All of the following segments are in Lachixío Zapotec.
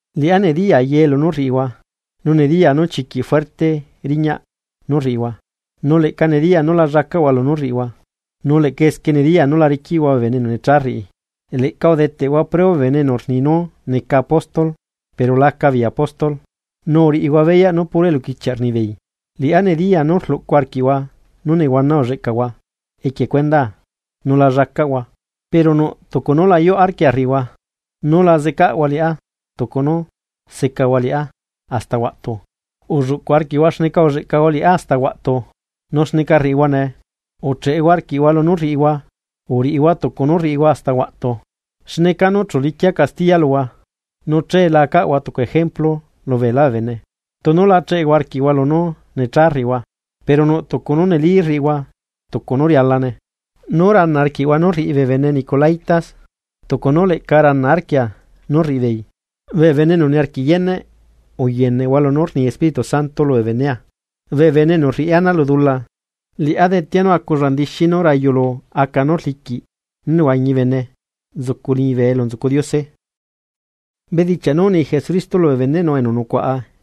Liꞌá nediyaa ye lunú rriꞌihua, nu nediyaa nú chiquiꞌ fuerte riñaꞌ nú rriꞌihua, nu leꞌca nediyaa nú la llacaꞌhua lunú rriꞌihua. Nu leꞌca esquie nediyaa nú la riquiꞌhua bee bene enu necha rriꞌi. Leꞌca udeteꞌhua preo bee bene enu rni nú neca apóstol pero laca beei apóstol, nu uriꞌihua beyaꞌ nú puro eluquichiaꞌ rnibeei. Liꞌá nediyaa nú rluꞌcu arquiꞌhua nu nehuana ulleꞌcahua equie cuendaa nu lá llacaꞌhua. Pero nuꞌ tucu nú la yuꞌ arquia rriꞌihua, nú la zecaꞌhua liꞌá tucu nú secahua liꞌá hasta huaꞌtu. Ulluꞌcu arquiꞌhua xneca uzecahua liꞌá hasta huaꞌtu nu xneca rriꞌihua nee. Ucheꞌehua arquiꞌhua lunú rriꞌihua, uriꞌihua tucu nú rriꞌihua hasta huaꞌtu, xne canu chu liquia castiya luhua nu che la acaꞌhua tucu ejemplu lubeelá bee bene, tunu la cheꞌehua arquiꞌhua lunú necha rriꞌihua. Pero nuꞌ tucu nú neli rriꞌihua tucu nú rialane, nú rana arquiꞌhua nú rriꞌi bee bene nicolaítas, tucu nú leꞌca rana arquia nú rriꞌibeei. Bee bene enu niarquiꞌ yeneꞌ, uyeneꞌhua lunú rni Espíritu Santo lubee benea: “Bee bene enu rriꞌi ana lu dula, liꞌá detea nú aculla ndixi nú rayu lu aca nú rliquiꞌ nú nehuañi bene nzucu liñibe elu nzucu Diose. Bedichiaꞌ nú uni Jesucristo lubee beneꞌnu enu nucuaꞌa.”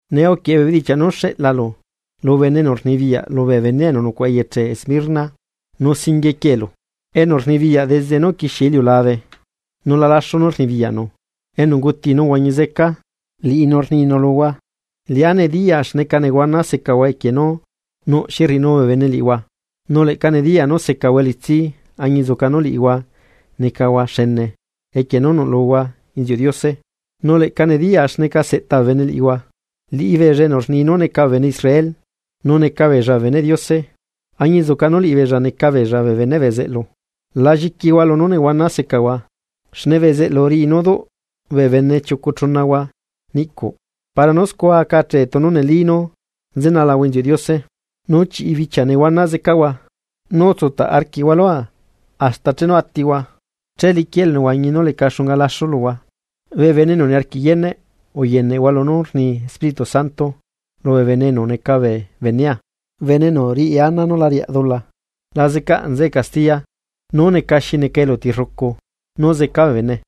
’Nee uquieꞌe bee bedichiaꞌ nú xeꞌlalu lu bene enu rnibiyaꞌ lubee benea enu nucuaꞌa eyeche Esmirna. Nu singuie quieꞌelu: “Enu rnibiyaꞌ desde chenu uquixie iliulabe, nu la laxu nú rnibiyaꞌnu, enu unguti nu uhuañi zeca, liꞌinu rninu luhua: Liꞌá nediyaa xneca nehuana secahua equie nú nuꞌ xi rriꞌinu bee bene liꞌihua, nu leꞌca nediyaa nú secahua elitsi añinzuca nú liꞌihua necahua xene equie nú nuꞌlulahua inziuꞌ Diose. Nu leꞌca nediyaa xneca seꞌta bee bene liꞌihua, liꞌibeella enu rni nú neca bee bene Israel nu neca bee beneꞌ Diose, añinzuca nú liꞌibeella neca beella bee beneꞌ bezeꞌlu. La lliquihua lunú nehuana secahua, xne bezeꞌlu riꞌi nú duꞌ bee bene chiucu chunahua niꞌcuꞌ para nú scua aca achee tunu neli nú nzenalahua inziuꞌ Diose. Nu chiꞌi bichia nehuana zecahua, nu utsutaꞌ arquiꞌhua lua hasta chenu atihua che liquia elunehuañi nú leca xunga laxu luhua. Bee bene enu niarquiꞌ yeneꞌ uyeneꞌhua lunú rni Espíritu Santo lubee bene enu neca bee benea: Bene enu riꞌi ana nú la riaꞌ dula la zecaꞌ nzeꞌe castiya nú neca xi neca eluti rrucu, nú zeca bee bene.”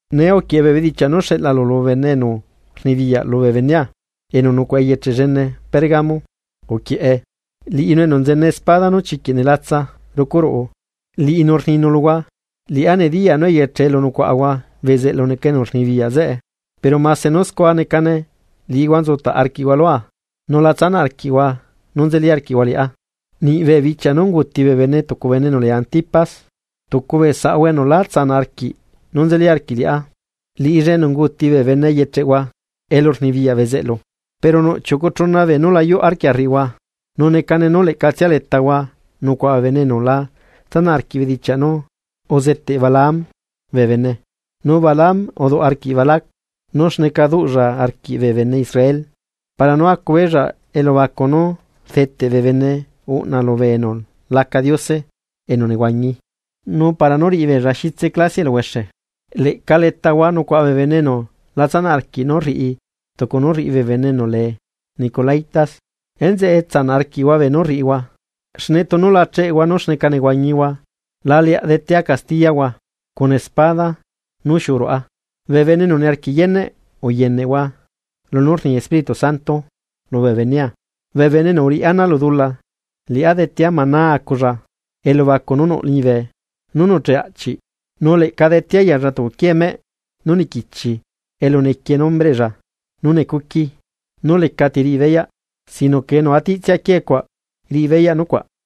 ’Nee uquieꞌe bee bedichiaꞌ nú xeꞌlalu lu bene enu rnibiyaꞌ lubee benea enu nucuaꞌa eyeche llene Pérgamo. Uquieꞌe: “Liꞌinu enu nzene espada nú chiquiꞌ nelatsa rucu ruꞌu, Liꞌinu rninu luhua: Liꞌá nediya nú eyeche elu nucuaꞌahua bezeꞌlu neca enu rnibiyaꞌ zeꞌe. Pero mase nú scua necane liꞌihua nzutaꞌ arquiꞌhua lua nu la tsanaꞌ arquiꞌhua nú nzeli arquiꞌhua liꞌá niꞌ bee bichia nú unguuti bee bene tucu bene enu lee Antipas, tucu bee saꞌhua enu lá tsanaꞌ arquiꞌ nú nzeli arquiꞌ liꞌá, liꞌilla enu unguuti bee bene eyecheꞌhua elurnibiyaꞌ bezeꞌlu. Pero nuꞌ chiucu chuna beenú la yuꞌ arquia rriꞌihua. Nu necane nú leꞌcatsia letahua nucuaꞌa bee bene enu la tsanaꞌ arquiꞌ bedichiaꞌ nú uzeteꞌ Balaam bee bene, nu Balaam uduꞌ arquiꞌ Balac nú xneca duꞌlla arquiꞌ bee bene Israel para nú acubeella elubacu nú rdeteꞌ bee bene uꞌna lubee enu laca diose enu nehuañi nu para nú riꞌibeella xitse clasiaꞌ eluhuexe. Leꞌca letahua nucuaꞌa bee bene enu la tsanaꞌ arquiꞌ nú rriꞌi tucu nú rriꞌi bee bene enu lee nicolaítas. Enzeꞌe tsanaꞌ arquiꞌhua beenú rriꞌihua, xne tunu la cheꞌehua nú xneca nehuañihua, la leaꞌ detea castiyahua cuna espada nú xiuꞌu ruꞌa. ¡Bee bene enu niarquiꞌ yeneꞌ uyeneꞌhua lunú rni Espíritu Santo lubee benea! Bee bene enu uriꞌi ana lu dula, liꞌá detea maná aculla, elubacu nú nuꞌ liñibe, nú nuꞌcheꞌ aꞌchiꞌ. Nu leꞌca detea yalla tucu quiee meꞌ nú niquichi elu nequie nombreꞌlla nú necuqui nú lecati riꞌi beyaꞌ, sino que enu atiꞌtsia quiee cuaꞌ riꞌi beyaꞌ nucuaꞌ.”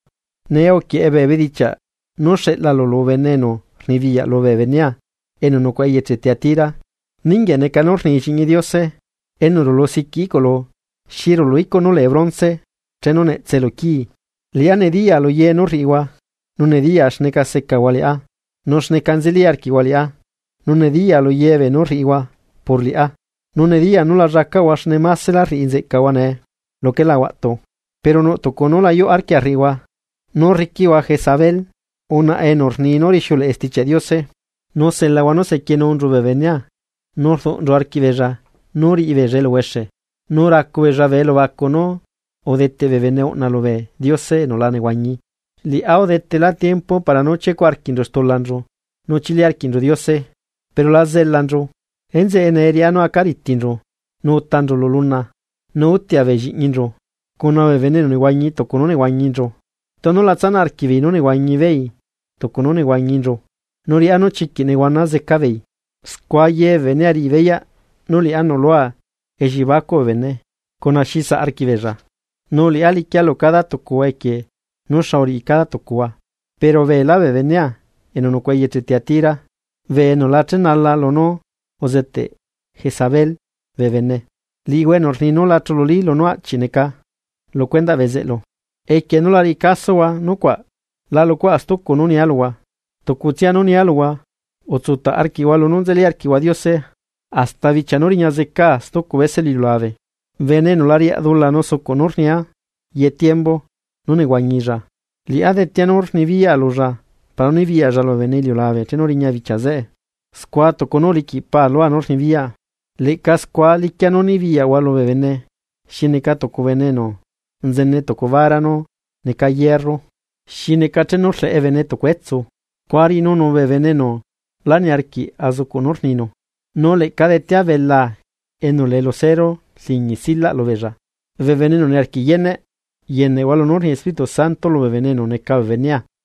’Nee uquieꞌe bee bedichiaꞌ nú xeꞌlalu lu bene enu rnibiyaꞌ lubee benea enu nucuaꞌa eyeche Tiatira: “Ninguieꞌ neca nú rni Lliꞌñi Diose, enu rulu siquiꞌ iꞌculu xi rulu icuꞌ nú lee bronce chenu netsee lu quii: Liꞌá nediya luye nú rriꞌihua, nu nediyaa xneca secahua liꞌá, nu xneca nzeli arquiꞌhua liꞌá, nu nediyaa lu ye beenú rriꞌihua por liꞌá, nu nediyaa nú la llacaꞌhua xne másela rriꞌi nzeꞌcahua nee luquela huaꞌtu. Pero nuꞌ tucu nú la yuꞌ arquia rriꞌihua nú rriquiꞌhua Jezabel, unaꞌa enu rni nú rixiuleꞌe Stichiaꞌ Diose. Nu selahua nú sequienunchu bee benea nu rduꞌnchu arquiꞌbeella nú riꞌibeella eluhuexe, nu racubeella bee elubacu nú udeteꞌ bee bene uꞌna lubee diose enu la nehuañi. Liꞌá udetela tiempo para nú chiecuꞌ arquiꞌnchu stulanchu nu chili arquiꞌnchu Diose, pero la zelanchu. Enzeꞌe nee riꞌá nú aca ritinchu nu utanchu lu luna. Nu utia bee lliꞌñinchu, cuna bee bene enu nehuañi tucu nú nehuañinchu, tunu la tsanaꞌ arquiꞌbeei nú nehuañibeei tucu nú nehuañinchu, nu riꞌá nú chiquiꞌ nehuana zecabeei. Scua ye bee benea riꞌi beyaꞌ nú liꞌá nuꞌlua elliebacuꞌ bee bene cuna xi saꞌ arquiꞌbeella. Nu liꞌá liquia lu cada tucuhua equie nu xa uriꞌi cada tucuhua. Pero beelá bee benea enu nucuaꞌa eyeche Tiatira, bee enu la chenala lunú uzeteꞌ Jezabel bee bene, liꞌihua enu rni nú la chululi lunú aꞌchiꞌ neca lu cuendaꞌ bezeꞌlu, equie nú la riꞌi casohua nucuaꞌ la luꞌcuaꞌa stucu nú nia luhua. Tucutsia nú nia luhua, utsutaꞌ arquiꞌhua lunú nzelila arquiꞌhua Diose hasta bichia nú riña zecaa stucu bese lu iliulabe. Bene enu la riaꞌ dula nu sucuꞌ nú rnia ye tiembu nú nehuañilla, liꞌá detea nú rnibiyaꞌa lulla para nú nibiyaꞌlla lubee bene iliulabe chenu riña bichia zeꞌe. Scua tucu nú uliquiꞌ Paa lua nú rnibiyaꞌa, leꞌca scua liquia nú nibiyaꞌhua lubee bene xi neca tucu bene enu nzene tucu vara nú neca hierro, xi neca chenu rleꞌe bene tucu etsu scua riꞌinunu bee bene enu lá niarquiꞌ azucuꞌ nú rniru, nu leꞌca detea belaa enu lee lucero rliñi silaꞌ lubeella. Bee bene enu niarquiꞌ yeneꞌ, yeneꞌhua lunú rni Espíritu Santo lubee bene enu neca bee benea.”